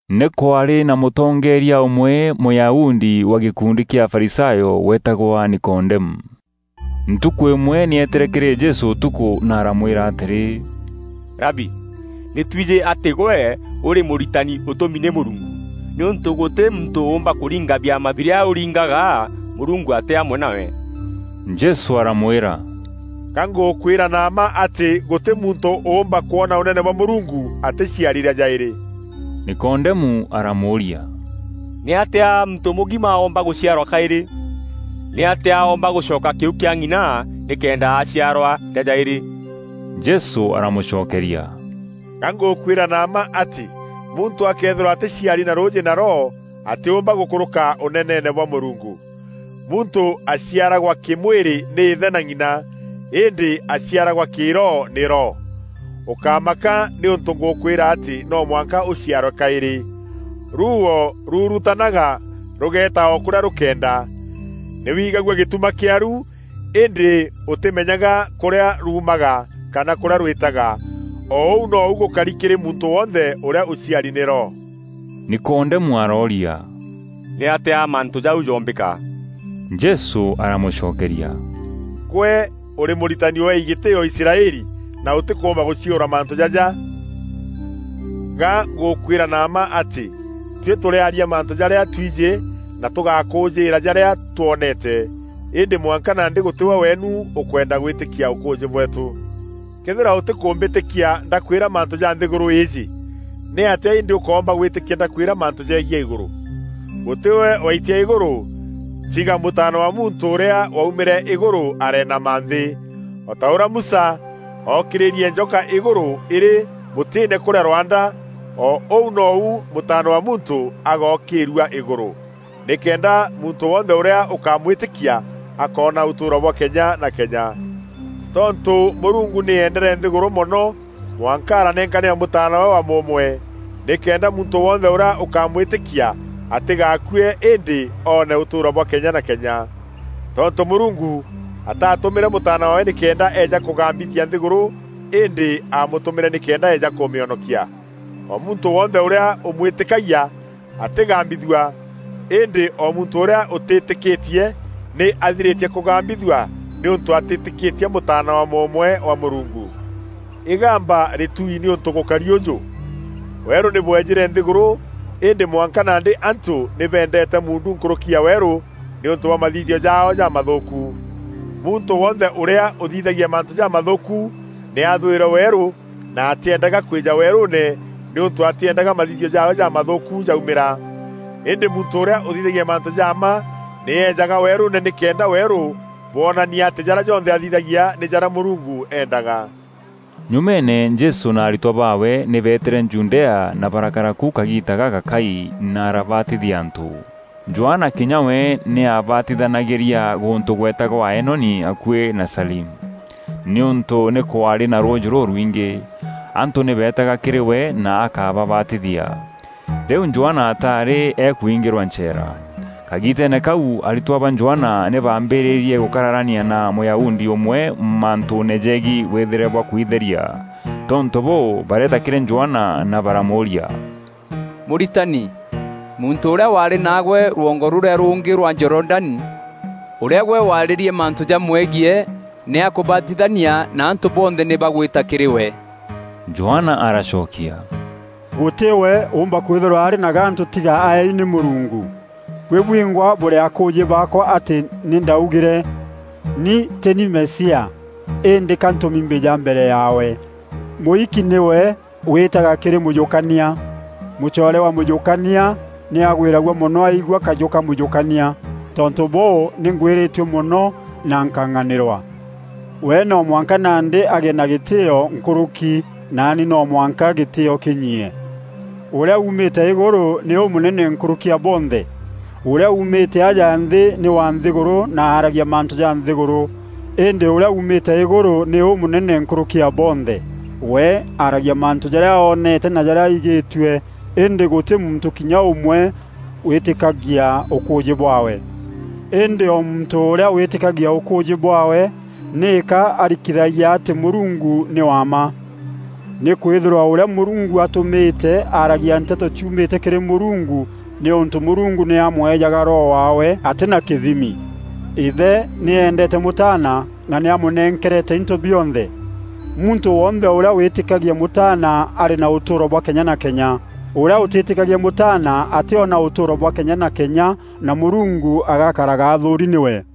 Nî kwaarî na mûtongeeria ûmwe Mûyahudi wa gîkundi kîa Afarisayo weetagwa Nikodemu. Ntukû îmwe nî eetîre kîrî Jesû ûtukû na aramwîra atîrî, “Rabi, nî twijî atî gwe ûrî mûritani ûtûmi nî Mûrungu, nîûntû gûtî muntû ûûmba kûringa biama birîa urîngaga Mûrungu atî amwe nawe.” Jesû aramwîra, “Ga ngûkwîra na mma atî gûtî muntû ûûmba kwona Ûnene bwa Mûrungu atîciari rîa jaîrî.” Nikodemu aramûûria, “Nîatîa muntû mûgima oomba gûciarwa kaîrî? Nîatîa oomba gûcoka kîu kîa ng'ina nîkenda aciarwa rîa jaîrî?” Jesû aramûcokeria, “Ga ngûkwîra na mma atî muntû akëethîrwa atîciari na rûûjî na Roho, atîûmba gûkûrûka Ûneneene bwa Mûrungu. Muntû aciaragwa kî-mwîrî nî îthe na ng'ina, îndî aciaragwa kî-roho nî Roho. Ûkámaka nîûntû ngûkwîra atî no mwanka ûciarwe kaîrî. Ruuo ruurutanaga rûgeeta o kûrîa rûkeenda; nî wigagua gîtuma kîaru îndî ûtîmenyaga kûrîa ruumaga kana kûrîa rwîtaga. O ûu nou gûkari kîrî muntû wonthe ûrîa ûciari nî Roho.” Nikodemu arooria, “Nîatîa mantû jau joombîka?” Jesû aramûcokeria, “Gwe ûrî mûritani ûeei gîtîîo Israeli, na ûtîkûûmba gûciûra mantû jaja? Ga ngûkwîra na mma atî tuî tûrîaria mantû jarîa twijî na tûgakûûjîîra jarîa twoneete, îndî mwanka nandî gûtî we weenu ûkwenda gwîtîkia ûkûûjî bweetû. Këethîra ûtîkûmbîtîkia ndakwîra mantû ja nthîgûrû îîjî, nîatîa îndî ûkoomba gwîtîkia ndakwîra mantû jegiî Îgûrû? Gûtî we waitia Îgûrû tiga Mûtaana wa Muntû ûrîa waumîre Îgûrû areenama nthî. “O ta ûrîa Musa ookîrîrie njoka îgûrû îrî mûtîîne kûrîa rwanda, o ûu nou Mûtaana wa Muntû agookîîrua îgûrû, nîkenda muntû wonthe ûrîa ûkamwîtîkia akoona ûtûûro bwa kenya na kenya. Tontû Mûrungu nî eendere nthîgûrû mono mwanka aranenkanîra Mûtaana waawe wa mûûmwe, nîkenda muntû wonthe ûrîa ûkamwîtîkia atîgaakue îndî oone ûtûûro bwa kenya na kenya. Tontû Mûrungu ataatûmîre Mûtaana waawe nîkenda eeja kûgambithia nthîgûrû, îndî aamûtûmîre nîkenda eeja kûmîonokia. “O muntû wonthe ûrîa ûmwîtîkagia atîgambithua; îndî o muntû ûrîa ûtîîtîkîtie, nî aathirîtie kûgambithua nîûntû atîtîkîtie Mûtaana wa mûûmwe wa Mûrungu. Îgamba rîtuui nîûntû gûkari ûjû: Weerû nî bwejîre nthîgûrû îndî mwanka nandî antû nî beendeete muundu nkûrûki ya weerû nîûntû bwa mathithio jaao jamathûûku. Muntû wonthe ûrîa ûthithagia mantû jamathûûku nî aathwîre weerû na atîendaga kwîja weerûûne nîûntû atîendaga mathithio jaawe jamathûûku jaumîra. Îndî muntû ûrîa ûthithagia mantû ja mma nî ejaga weerûûne nîkenda weerû bwonania atî jarîa jonthe athithagia nî jarîa Mûrungu eendaga.” Nyumeene Jesû na aritwa baawe nî beetîre Judea na barakara ku kagiita gagakai na arabatithia antû. Johana kinya we nî aabatithanagîria gûntû gweetagwa Aenoni, akuî na Salimu, nîûntû nî kwaarî na rûûjî rûrwingî. Antû nî beetaga kîrî we na akababatithia. Rîu Johana ataarî akuingîrwa ncheera. Kagiiteene kau, aritwa ba Johana nî baambîrîîrie gûkararania na Mûyahudi ûmwe mantûûne jegiî wîthîre bwa kwitheria. Tontû bûû, bareeta kîrî Johana na baramûûria, “Mûritani, muntû ûrîa waarî naagwe rwongo rûrîa rûngî rwa Jorodani, ûrîa gwe waarîrie mantû jamwegiî nî akûbatithania na antû bonthe nî bagwîta kîrî we.” Johana aracokia, “Gûtî we ûûmba kwîthîrwa arî na gantû tiga aeei nî Mûrungu. Buî bwingwa bûrî akûûjî baakwa atî nî ndaugîre, ‘Ni tî ni Mesia, îndî ka ntûmi mbîja mbere yaawe.’ Mûiki nîwe wîîtaga kîrî mûjûkania; mûcoore wa mûjûkania nî agwîragua mono aigua kajû ka mûjûkania. Tontû bûû, nî ngwîrîtue mono na nkang'anîrwa. We no mwanka nandî agîe na gîtîîo nkûrûki naani no mwanka gîtîîo kînyiie. “Ûrîa uumîte Îgûrû nî ûmûnene nkûrûki ya bonthe. Ûrîa uumîte aja nthî nî wa nthîgûrû na aaragia mantû ja nthîgûrû, îndî ûrîa uumîte Îgûrû nî ûmûnene nkûrûki ya bonthe. We aaragia mantû jarîa oonete na jarîa aigîtue îndî gûtî muntû kinya ûmwe wîtîkagia ûkûûjî bwaawe. Îndî o muntû ûrîa wîtîkagia ûkûûjî bwaawe nîka arikithagia atî Mûrungu nî wa mma. Nîkwîthîrwa ûrîa Mûrungu atûmîte aaragia nteto ciumîte kîrî Mûrungu nîûntû Mûrungu nî amweejaga Roho waawe atî na kîthimi. Îthe nî eendeete Mûtaana na nî amûnenkerete into bionthe. Muntû wonthe ûrîa wîtîkagia Mûtaana arî na ûtûûro bwa kenya na kenya; ûrîa ûtîîtîkagia Mûtaana atîona ûtûûro bwa kenya na kenya na Mûrungu agakaraga athûûri nîwe.”